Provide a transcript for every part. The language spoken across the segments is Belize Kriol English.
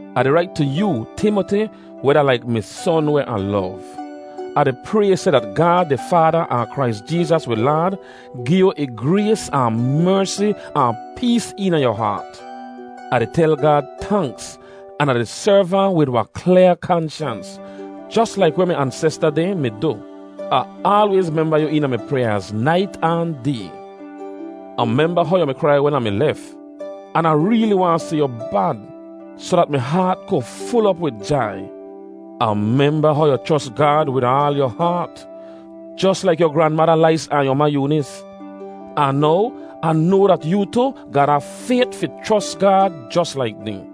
Ah di rait tu yoo, Timoti, weh da laik mi son weh Ah lov. Ah di pray seh dat Gaad di Faada ahn Krais Jeezas wi Laad gi yu ih grays ahn mersi ahn pees eena yu haat. Ah di tel Gaad tanks, an Ah di serv ahn wid wahn klyaa kanshans, jos laik weh mi ansesta dehn mi du. Ah aalwayz memba yu eena mi pryaaz nait ahn day. Ah memba how yu mi krai wen Ah mi lef, an Ah reeli waahn si yu bad, soh dat mi haat ku ful op wid jai. Ah memba how yu chros Gaad wid aal yu haat, jos laik yu granmada Lais ahn yu ma Yoonis. Ahn now, Ah noa dat yoo tu ga da fayt fi chros Gaad jos laik dehn.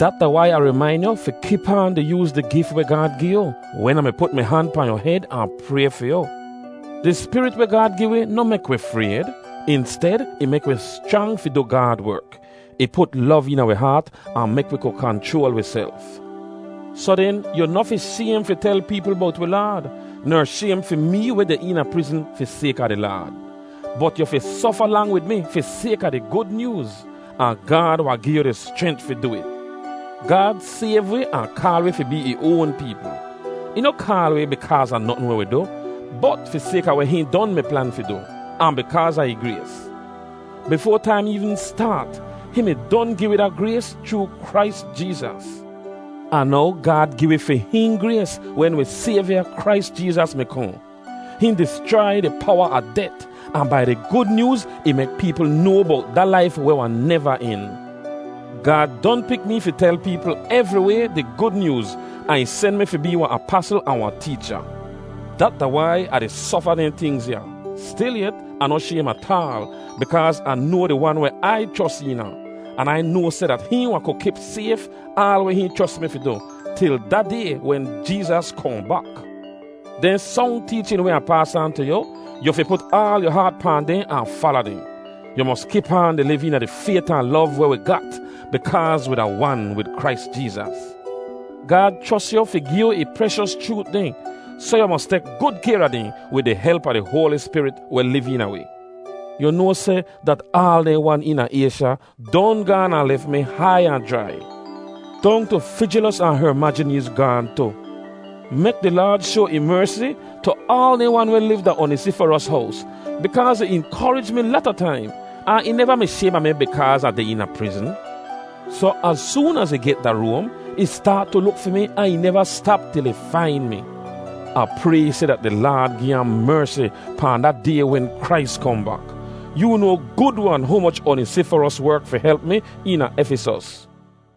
Dat da wai Ah rimain yu fi kip aan di yooz di gif weh Gaad gi yu wen Ah mi put mi han pahn yu hed ahn pray fi yu. Di Spirit weh Gaad gi wi noh mek wi frayd. Insted, ih mek wi schrang fi du Gaad werk. Ih put lov eena wi haat ahn mek wi ku kanchroal wiself. Soh den, yu noh fi shaym fi tel peepl bowt wi Laad, ner shaym fi mee weh deh eena prizn fi sayka di Laad. Bot yu fi sofa lang wid mi fi sayka a di Gud Nyooz, ahn Gaad wahn gi yu di schrent fi du it. Gaad sayv wi ahn kaal wi fi bee ih oan peepl. Ih noh kaal wi bikaaz a notn weh wi du, bot fi sayka a weh hihn don mi plan fi du, ahn bikaaz a ih grays. Bifoa taim eevn staat, hihn mi don gi wi da grays chroo Krais Jeezas. Ahn now Gaad gi wi fi hihn grays wen wi Sayvya Krais Jeezas mi kohn. Hihn dischrai di powa a det, ahn bai di Gud Nyooz ih mek peepl noa bowt da laif weh wahn neva en. Gaad don pik mee fi tel peepl evriway di Gud Nyooz ahn ih sen mi fi bee wahn apasl ahn wahn teecha. Dat da wai Ah di sofa dehn tingz ya. Stilyet, Ah noh shaym ataal, bikaaz Ah noa di Wan weh Ai chros eena. An Ai noa seh dat hihn wahn ku kip sayf aal weh hihn chros mi fi du, til da day wen Jeezas kohn bak. Dehn song teechin weh Ah paas aan tu yu, yu fi put aal yu haat pahn dehn ahn fala dehn. Yu mos kip aan di liv eena di fayt ahn lov weh wi gat bikaaz wi da wan wid Krais Jeezas. Gaad chros yu fi gi yu ih preshos chroot dehn, soh yu mos tek gud kayr a dehn wid di help a di Hoali Spirit weh liv eena wi. Yu noa seh dat aal dehn wan eena Aysha don gaan ahn lef mi hai ahn jrai. Dong tu Fijelos ahn Hermajeneez gaahn tu. Mek di Laad shoa ih mersi tu aal dehn wan weh liv da Onisiforos hows, bikaaz ih inkorij mi lata taim, ahn ih neva mi shaym a mi bikaaz Ah deh eena prizn. Soh, az soon az ih get da Roam, ih staat tu luk fi mi ahn ih neva stap til ih fain mi. Ah pray seh dat di Laad gi ahn mersi pahn da Day wen Krais kohn bak! Yoo noa gud-wan humoch Onisiforos werk fi help mi eena Efisos.